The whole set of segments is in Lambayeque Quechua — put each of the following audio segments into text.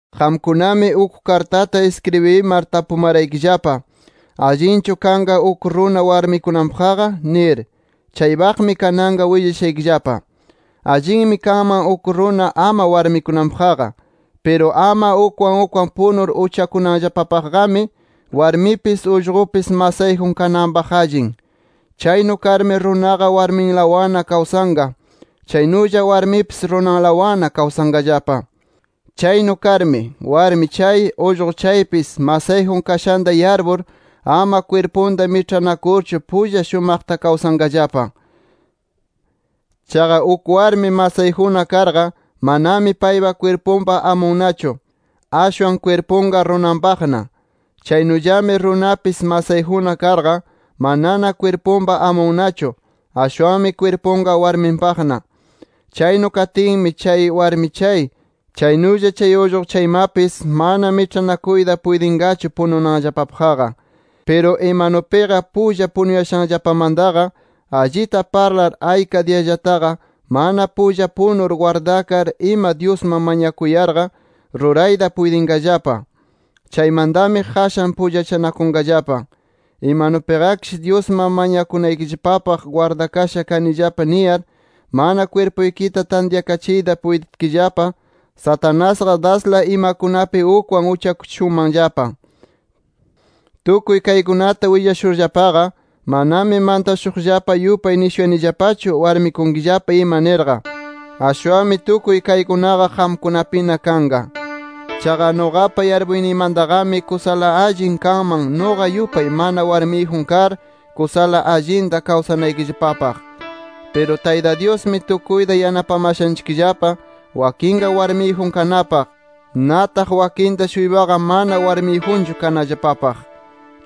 Qamkunami uk kartata iskribimar tapumaraykillapa. ¿Allinchu kanqa uk runa warmikunanpaqqa? nir. Chaypaqmi kananqa willashaykillapa. Allinmi kanman uk runa ama warmikunanpaqqa. Piru ama ukwan ukwan punur uchakunanllapapaqqami warmipis, ullqupis masayjun kananpaq allin. Chaynu karmi runaqa warminlawanna kawsanqa, chaynulla warmipis runanlawanna kawsanqallapa. Chaynu karmi, warmi chay, ullqu chaypis masayjun kashanta yarpur, ama kwirpunta miĉhanakurchu pulla shumaqta kawsanqallapa. Chaqa uk warmi masayjunna karqa, manami payqa kwirpunpa amunnachu, ashwan kwirpunqa runanpaqna. Chaynullami runapis masayjunna karqa, manana kwirpunpa amunnachu, ashwanmi kwirpunqa warminpaqna. Chaynu katinmi, chay warmi chay, chaynulla chay ullqu chaymapis mana miĉhanakuyta puytinqachu pununanllapapaqqa. Piru imanupiqa pulla punuyashanllapamantaqa, allita parlar ayka diyallataqa mana pulla punur gwardakar ima Dyusman mañakunayarqa, rurayta puytinqallapa. Chaymantami qashan pullachanakunqallapa. Imanupiqakish Dyusman mañakunaykillapapaq gwardakasha kanillapa niyar, mana kwirpuykita tantyakachiyta puytitkillapa, Satanasqa dasla imakunapi ukwan uchakuchishunmanllapa. Tukuy kaykunata willashurllapaqa, manami mantashuqllapa yupay nishuyanillapachu warmikunkillapa ima nirqa. Ashwanmi tukuy kaykunaqa qamkunapina kanqa. Chaqa nuqapa yarpuyniymantaqami, kusala allin kanman nuqa yupay mana warmiyjun kar, kusala allinta kawsanaykillapapaq. Piru Tayta Dyusmi tukuyta yanapamashanchikllapa wakinqa warmiyjun kanapaq, nataq wakinta-shuypaqa mana warmiyjunchu kanallapapaq.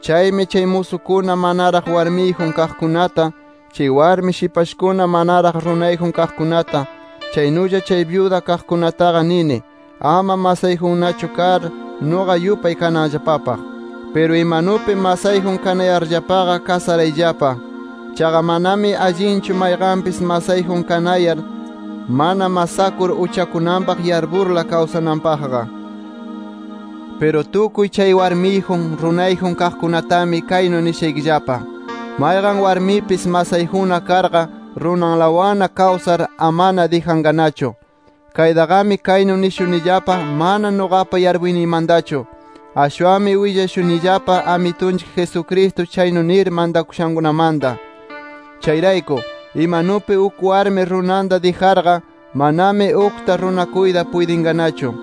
Chaymi chay musukuna manaraq warmiyjun kaqkunata, chay warmi shipashkuna manaraq runayjun kaqkunata, chaynulla chay byuda kaqkunataqa nini, ama masayjunnachu kar, nuqa yupay kananllapapaq. Piru imanupi masayjun kanayarllapaqa, kasarayllapa. Chaqa manami allinchu mayqanpis masayjun kanayar, mana masakur uchakunanpaq yarpurla kawsananpaqqa. Piru tukuy chay warmiyjun, runayjun kaqkunatami kaynu nishaykillapa: Mayqan warmipis masayjunna karqa, runanlawanna kawsar amana dijanqanachu. Kaytaqami kaynu nishunillapa mana nuqapa yarpuyniymantachu. Ashwanmi willashunillapa Amitunchik Jesucristo chaynu nir mantakushankunamanta. Chayrayku, imanupi uk warmi runanta dijarqa, mananami ukta runakuyta puytinqanachu.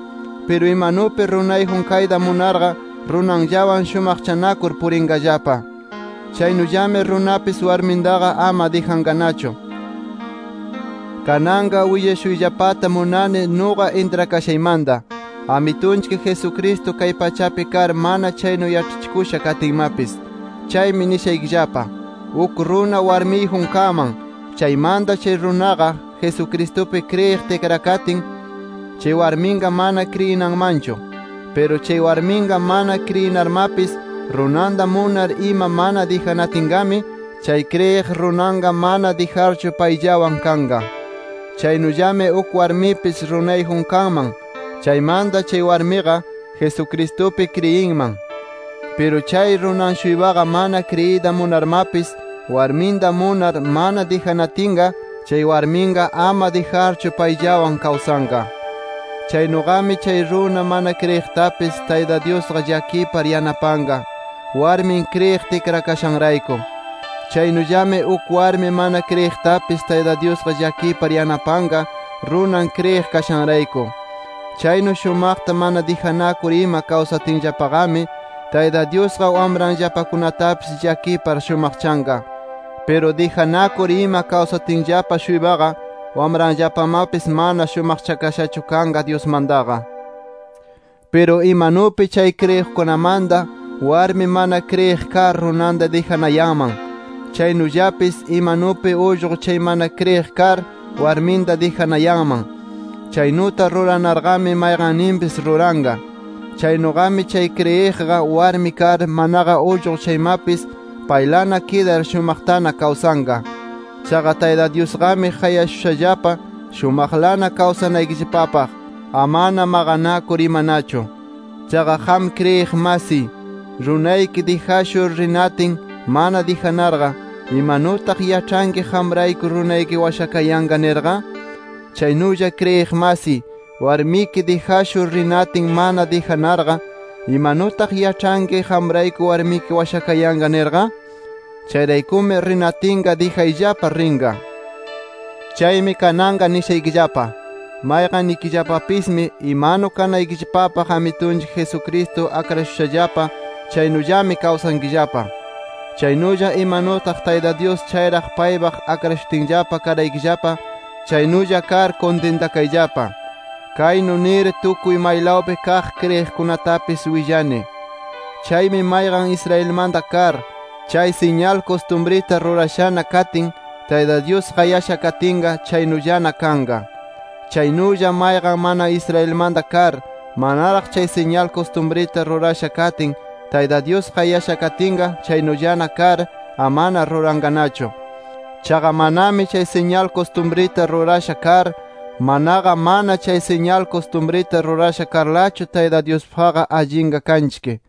Piru imanupi runayjun kayta munarqa, runanllawan shumaqchanakur, purinqallapa. Chaynullami runapis warmintaqa ama dijanqanachu. Kananqa willashuyllapata munani nuqa intrakashaymanta, Amitunchik Jesucristo kay pachapi kar mana chaynu yaĉhachikusha katinmapis. Chaymi nishaykillapa: Uk runa warmiyjun kanman, chaymanta chay runaqa, Jesucristupi kriyiq tikrakatin, chay warminqa mana kriyinanmanchu. Piru chay warminqa mana kriyinarmapis runanta munar ima mana dijanatinqami, chay kriyiq runanqa mana dijarchu payllawan kanqa. Chaynullami uk warmipis runayjun kanman, chaymanta chay warmiqa, Jesucristupi kriyinman. Piru chay runan-shuypaqa mana kriyiyta munarmapis, warminta munar mana dijanatinqa, chay warminqa ama dijarchu payllawan kawsanqa. Chaynuqami chay runa mana kriyiqtapis Tayta Dyusqa llakipar yanapanqa, warmin kriyiq tikrakashanrayku. Chaynullami uk warmi mana kriyiqtapis Tayta Dyusqa llakipar yanapanqa runan, kriyiq kashanrayku. Chaynu shumaqta mana dijanakur ima kawsatinllapaqami, Tayta Dyusqa wamranllapakunatapis llakipar shumaqchanqa. Piru dijanakur ima kawsatinllapa-shuypaqa wamranllapamapis mana shumaqchakashachu kanqa Dyusmantaqa. Piru imanupi chay kriyiqkunamanta, warmi mana kriyiq kar runanta dijanayanman, chaynullapis imanupi ullqu chay mana kriyiq kar, warminta dijanayanman. Chaynuta ruranarqami mayqanninpis ruranqa. Chaynuqami, chay kriyiqqa warmi kar, manaqa ullqu chaymapis paylana kidar shumaqtana kawsanqa. Chaqa Tayta Dyusqami qayashushallapa, shumaqlana kawsanaykillapapaq, amana maqanakur imanachu. Chaqa qam kriyiq masiy, runayki dijashur rinatin, mana dijanarqa ¿imanutaq yaĉhanki qamrayku runayki washakayanqa nirqa? Chaynulla kriyiq masiy, warmiki dijashur rinatin mana dijanarqa, ¿imanutaq yaĉhanki qamrayku warmiki washakayanqa nirqa? Chayraykumi rinatinqa dijayllapa rinqa. Chaymi kananqa nishaykillapa: Mayqannikillapapismi imanu kanaykillapapaq Amitunchik Jesucristo akrashushallapa chaynullami kawsankillapa. Chaynulla imanutaq Tayta Dyus chayraq paypaq akrashutinllapa karaykillapa, chaynulla kar kuntintakayllapa. Kaynu nir tukuy maylawpi kaq kriyiqkunatapis willani. Chaymi mayqan Israelmanta kar, chay siñal kustumrita rurashana katin, Tayta Dyus qayasha katinqa, chaynullana kanqa. Chaynulla mayqan mana Israelmanta kar, manaraq chay siñal kustumrita rurasha katin Tayta Dyus qayasha katinqa, chaynullana kar amana ruranqanachu. Chaqa manami chay siñal kustumrita rurasha kar, manaqa mana chay siñal kustumrita rurasha karlachu Tayta Dyuspaqqa allinqa kanchik.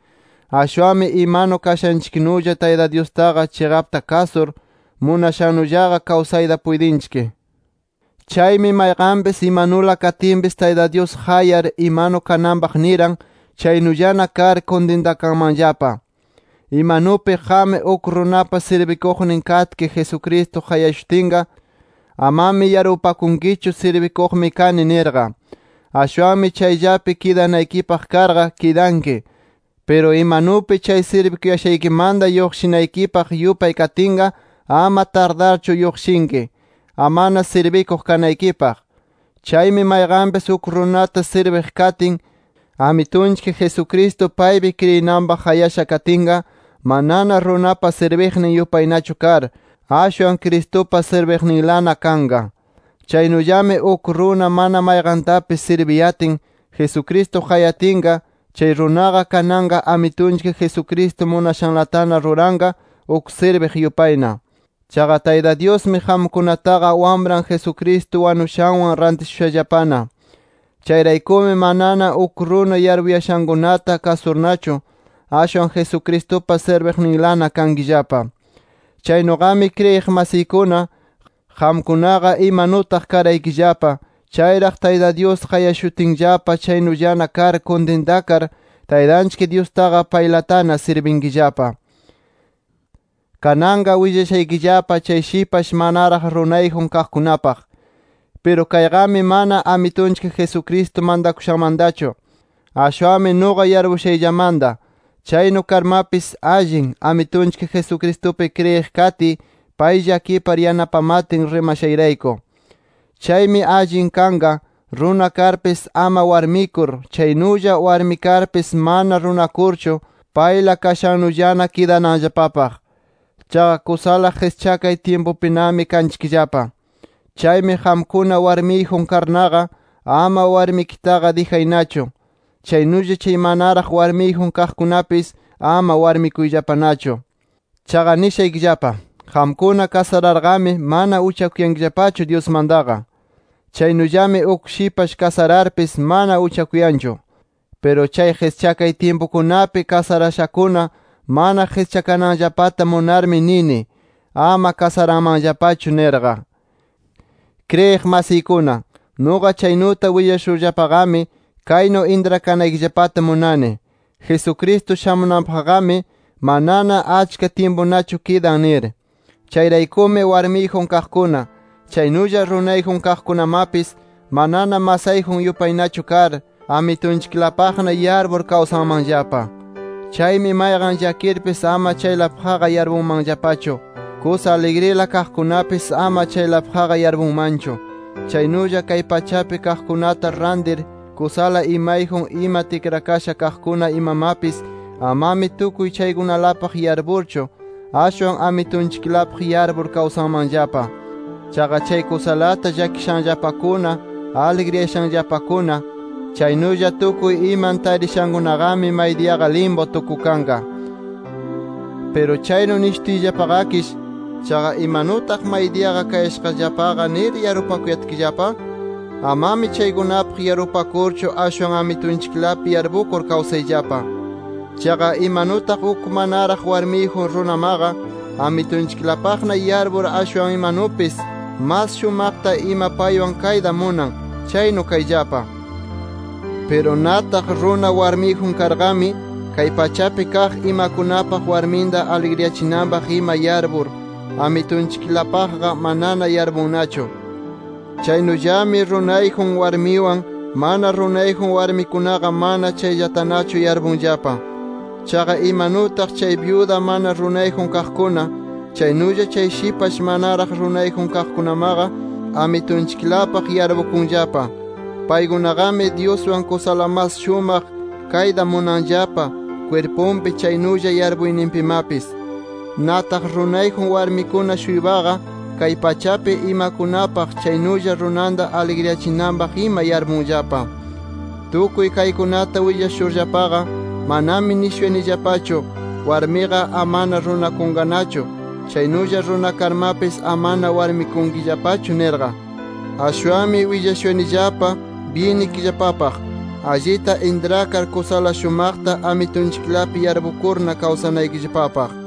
Ashwanmi imanu kashanchiknulla Tayta Dyustaqa chiqapta kasur, munashannullaqa kawsayta puytinchik. Chaymi mayqanpis, imanula katinpis Tayta Dyus qayar imanu kananpaq niran, chaynullana kar kuntintakanmanllapa. Imanupi qam uk runapa sirbikuqnin katki, Jesucristo qayashutinqa, amami yarpupakunkichu sirbikuqmi kani nirqa. Ashwanmi chayllapi kidanaykipaq karqa, kidanki. Piru imanupi chay sirbikuyashaykimanta lluqshinaykipaq yupay katinqa, ama tardarchu lluqshinki, amana sirbikuq kanaykipaq. Chaymi mayqanpis uk runata sirbiq katin, Amitunchik Jesucristo paypi kriyinanpaq qayasha katinqa, manana runapa sirbiqnin yupaynachu kar, ashwan Cristupa sirbiqninlana kanqa. Chaynullami uk runa mana mayqantapis sirbiyatin, Jesucristo qayatinqa, chay runaqa kananqa Amitunchik Jesucristo munashanlatana ruranqa, uk sirbiq yupayna. Chaqa Tayta Dyusmi qamkunataqa, Wamran Jesucristo wanushanwan rantishushallapana. Chayraykumi manana uk runa yarpuyashankunata kasurnachu, ashwan Jesucristupa sirbiqninlana kankillapa. Chaynuqami kriyiq masiykuna, qamkunaqa imanutaq karaykillapa chayraq Tayta Dyus qayashutinllapa chaynullana kar kuntintakar, Taytanchik Dyustaqa, paylatana sirbinkillapa. Kananqa willashaykillapa, chay shipash manaraq runayjun kaqkunapaq. Piru kayqami mana Amitunchik Jesucristo mantakushanmantachu, ashwanmi nuqa yarpushayllamanta. Chaynu karmapis allin, Amitunchik Jesucristupi kriyiq katiy pay llakipar yanapamatin rimashayrayku. Chaymi allin kanqa, runa karpis ama warmikur, chaynulla warmi karpis mana runakurchu payla kashannullana kidananllapapaq. Chaqa kusala qischakay tyimpupinami kanchikllapa. Chaymi, qamkuna warmiyjun karnaqa, ama warmikitaqa dijaynachu. Chaynulla chay manaraq warmiyjun kaqkunapis, ama warmikuyllapanachu. Chaqa nishaykillapa: Qamkuna kasararqami mana uchakuyankillapachu Dyusmantaqa. Chaynullami uk shipash kasararpis, mana uchakuyanchu. Piru chay qischakay tyimpukunapi kasarashakuna mana qischakananllapata munarmi, nini: Ama kasaranmanllapachu nirqa. Kriyiq masiykuna, nuqa chaynuta willashurllapaqami, kaynu intrakanaykillapata munani: Jesucristo shamunanpaqqami, manana achka tyimpunachu kidan nir. Chayraykumi warmiyjun kaqkuna, chaynulla runayjun kaqkunamapis, manana masayjun yupaynachu kar, Amitunchiklapaqna yarpur kawsanmanllapa. Chaymi mayqan llakirpis ama chaylapaqqa yarpunmanllapachu; kusa aligrila kaqkunapis ama chaylapaqqa yarpunmanchu; chaynulla kay pachapi kaqkunata rantir, kusala imayjun ima tikrakasha kaqkuna imamapis amami tukuy chaykunalapaq yarpurchu; ashwan Amitunchiklapaq yarpur kawsanmanllapa. Chaqa chay kusalata llakishanllapakuna, aligriyashanllapakuna, chaynulla tukuy iman tarishankunaqami, maydiyaqa limpu tukukanqa. Piru chaynu nishutiyllapaqakish ¿chaqa imanutaq maydiyaqa kayashaqllapaqa nir, yarpupakuyatkillapa? Amami chaykunapaq yarpupakurchu, ashwan Amitunchiklapi yarpukur kawsayllapa. Chaqa imanutaq uk manaraq warmiyjun runamaqa, Amitunchiklapaqna yarpur, ashwan imanupis mas shumaqta ima paywan kayta munan, chaynu kayllapa. Piru nataq runa warmiyjun karqami, kay pachapi kaq imakunapaq, warminta aligriyachinanpaq ima yarpur, Amitunchiklapaqqa manana yarpunnachu. Chaynullami runayjun warmiwan, mana runayjun warmikunaqa mana chayllatanachu yarpunllapa. Chaqa imanutaq chay byuda mana runayjun kaqkuna, chaynulla chay shipash manaraq runayjun kaqkunamaqa, Amitunchiklapaq yarpukunllapa. Paykunaqami Dyuswan kusala mas shumaq kayta munanllapa kwirpunpi, chaynulla yarpuyninpimapis. Nataq runayjun warmikuna-shuypaqa kay pachapi imakunapaq, chaynulla runanta aligriyachinanpaq ima yarpunllapa. Tukuy kaykunata willashurllapaqa, manami nishunayanillapachu warmiqa amana runakunqanachu, chaynulla runa karmapis amana warmikunkillapachu nirqa. Ashwanmi willashuyanillapa byinnikillapapaq, allita intrakar kusala shumaqta Amitunchiklapi yarpukurna kawsanaykillapapaq.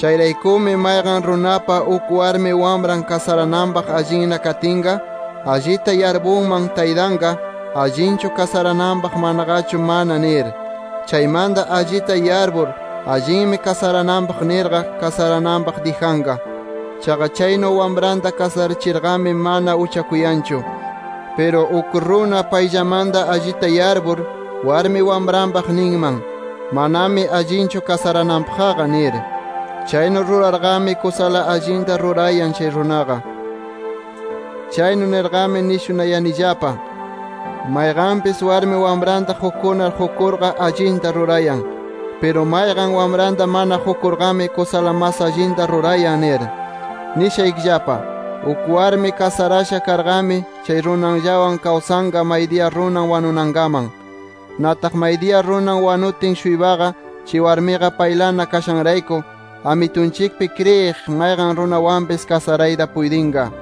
Chayraykumi mayqan runapa, uk warmi wamran kasarananpaq allinna katinqa, allita yarpunman taytanqa: Allinchu kasarananpaq, manaqachu mana nir. Chaymanta allita yarpur: Allinmi kasarananpaq nirqa, kasarananpaq dijanqa. Chaqa chaynu wamranta kasarachirqami, mana uchakuyanchu. Piru uk runa payllamanta allita yarpur, warmi wamranpaq ninman: Manami allinchu kasarananpaqqa nir. Chaynu rurarqami kusala allinta rurayan chay runaqa. Chaynu nirqami nishunayanillapa: Mayqanpis warmi wamranta qukunar, qukurqa allita rurayan. Piru mayqan, wamranta mana qukurqami, kusala mas allinta rurayan nir. Nishaykillapa: Uk warmi kasarasha karqami, chay runanllawan kawsanqa maydiya runan wanunankaman. Nataq maydiya runan wanutin-shuypaqa, chay warmiqa paylana kashanrayku, Amitunchikpi kriyiq, mayqan runawanpis kasarayta puytinqa.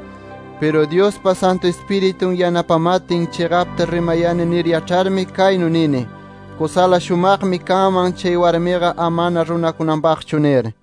Piru Dyuspa Santu Ispiritun yanapamatin, chiqapta rimayani nir yaĉharmi kaynu nini: Kusala shumaqmi kanman, chay warmiqa amana runakunanpaqchu nir.